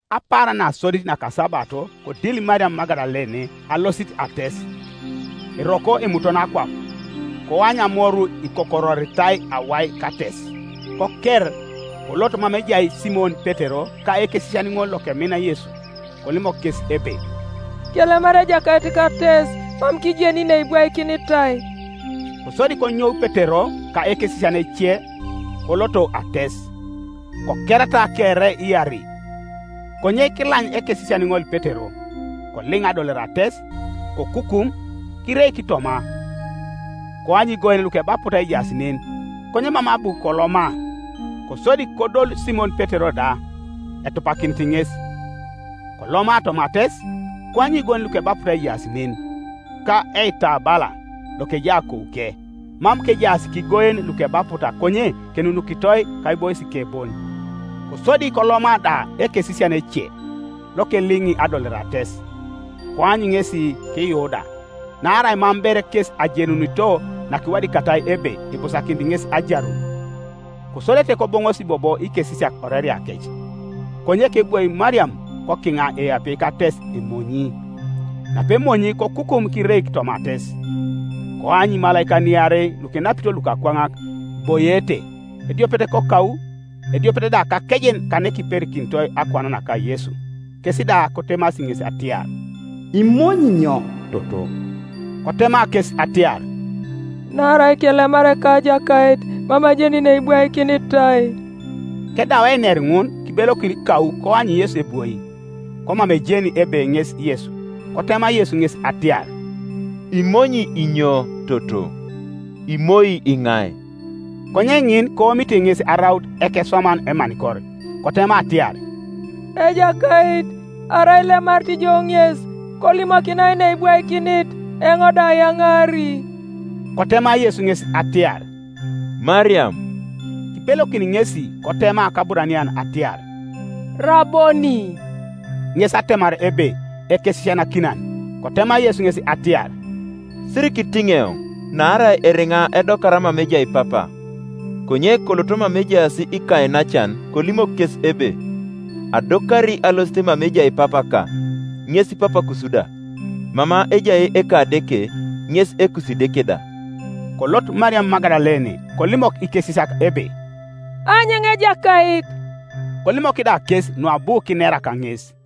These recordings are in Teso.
Apaaran nasodit nakasabato kodil Mariam Magadalene alosit ates, eroko emutono akwap, koany amoru ikokororitai awai kates. Koker, kolot mama ejai Simon Petero ka ekesisian ŋol lokemina Yesu, kolimok kes ebe, “Kelemar Ejakait kates, mam kijeni neibwaikinitai.” Kosodi konyou Petero ka ekesisian ece, koloto ates, Kokerata kere iarei, konye kilany ekesisian ŋol Petero, koliŋ adolore ates; kokukum, kireik toma, koany igoen lukebaputa ejaas nen, konye mam abu koloma. Kosodi kodolu Simon Petero da, etupakinit ŋes, koloma toma ates; koany igoen lukebaputa ejaas nen, ka eitabala, lokejai akouke, mam kejaas kigoen lukebaputa konye kenunukitoi kaiboisike bon. Kosodi koloma da ekesisian ece, lokeliŋi adolore ates, koany ŋesi kiyuu da; naarai mam ber kes ajenunito nakiwadikatai ebe ibusakinit ŋes ajarun, Kosodete koboŋosi bobo ikesisiak oreriakec. Konye kebwoi Mariam kokiŋa eapie kates emonyi, napemonyi kokukum kireik toma ates; koany imalaikan iarei lukenapito luakwaŋak, iboiete, ediopet kakou, ediopet da kakejen kanekiperikinitoi akuan naka Yesu. Kes da kotemasi ŋes atiar, “Imonyi inyo, toto?” Kotema kes atiar, “Naarai kelemar Ekajakait, mam ajeni neibwaikinitai.” Kedau einer ŋun kibelokin kau koany Yesu ebwoi, komam ejeni ebe ŋes Yesu, Kotema Yesu ŋes atiar, “Imonyi inyo, toto? Imoi iŋai?” Konye ŋin koomite ŋes araut ekeswaman emanikor, kotema atiar, “Ejakait, arai ilemarit ijo ŋes, kolimokinai neibwaikinit, eoŋ da ayaŋaari.” Kotema Yesu ŋes atiar, “Mariam,” Kibelokin ŋesi kotema kAburanian atiar, “Raboni!” (Ŋes atemar ebe, “Ekesisianakinan,”) Kotema Yesu ŋes atiar, “Sirikitiŋ eoŋ, naarai eriŋa edokara mama ejai Papa; konye kolot mama ejaas ikainacan kolimok kes ebe, Adokari alosit mama ejai Papaka, ŋes Papakus da, mama ejai Ekadeke, ŋes Ekusideke da.” Kolot Mariam Magadalene kolimok ikesisiak ebe, “Aanyu eoŋ Ejakait.” Kolimok da kes nuabu kinera kaŋes.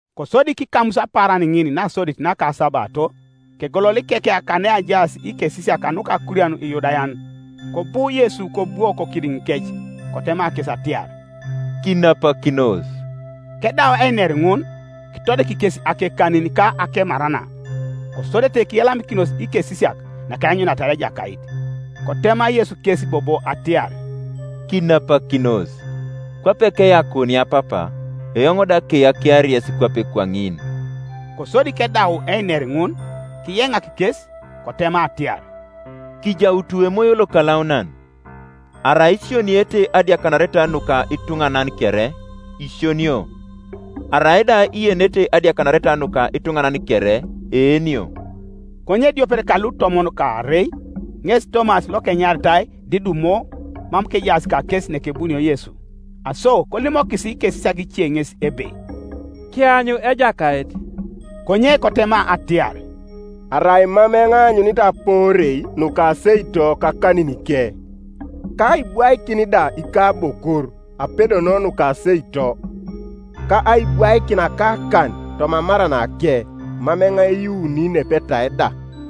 Kosodi kikamus apaaran ŋin nasodit naka asabato, kegolol ikekia kaneajaas ikesisiak kanuka akurian Iyudayan, kobu Yesu kobwo kokidiŋikec, kotema kes atiar, “Kinapakinos,” Kedau einer ŋun, kitodik kes akekanin ka akemarana. Kosodete kiyalamikinos ikesisiak nakeanyuniata Ejakait. Kotema Yesu kes bobo atiar, “Kinapakinos. Kwape keyakuunia Papa, eoŋ da keyakiari yes kwape kwaŋin.” Kosodi kedau einer ŋun, kiyeŋak kes, kotema atiar, “Kijautu Emoyo Lokalaunan. Arai isioniete adiakanareta nuka ituŋanan kere, isionio; arai da ienete adiakanareta nuka ituŋanan kere, eenio.” Konye ediopet ka lutomon kaarei, ŋes Tomas lokenyaritai Didumo mam kejaas kakes nakebunio Yesu. Aso kolimokis ikesisiak ice ŋes ebe, “Kianyu Ejakait.” Konye kotema atiar, “Arai mam eoŋ aanyunit apoorei nuka aseito kakaninike, ka aibwaikin da ikabokor apedon nuka aseito, ka aibwaikin akakan toma amaranake, mam eoŋ eyuuni nepetai da.”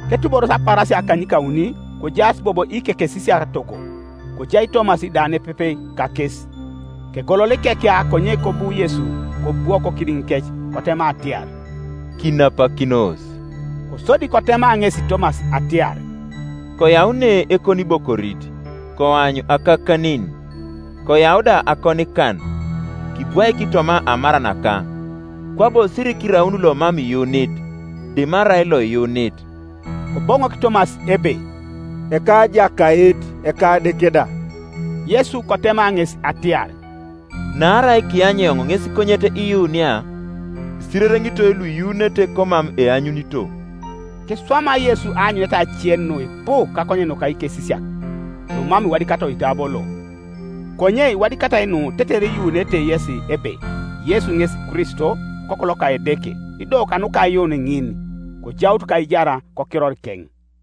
Ketuboros apaarasia akanykauni kojaas bobo ikekesisiak togo, kojai Tomas da nepepe kakes. Kegolol ikekia konye kobu Yesu kobwo kokidiŋikec, kotema atiar, “Kinapakinos,” Kosodi kotema ŋesi Tomas atiar, “Koyau ne ekonibokorit, koany akakanin; koyau da akonikan, kibwaik toma amaranaka; kwabo sirikiraun lomam iyuunit, dimarai loiyuunit.” Koboŋok Tomas ebe, “Ekajakait, Ekadeke da!” Yesu kotema ŋes atiar, “Naarai kiany eoŋ ŋes konyet iyuunia? Isirereŋitoi luiyuunete komam eanyunito.” Kiswama Yesu aanyuneta ace nuipu kakonyen nuka ikesisiak, numam iwadikatai oitabo lo; konye iwadikatai nu tetere iyuunete yesi ebe Yesu ŋes Kristo, Okoku loka Edeke, ido kanuka aiyuun ŋin kojaut kaijar kokirorikeŋ.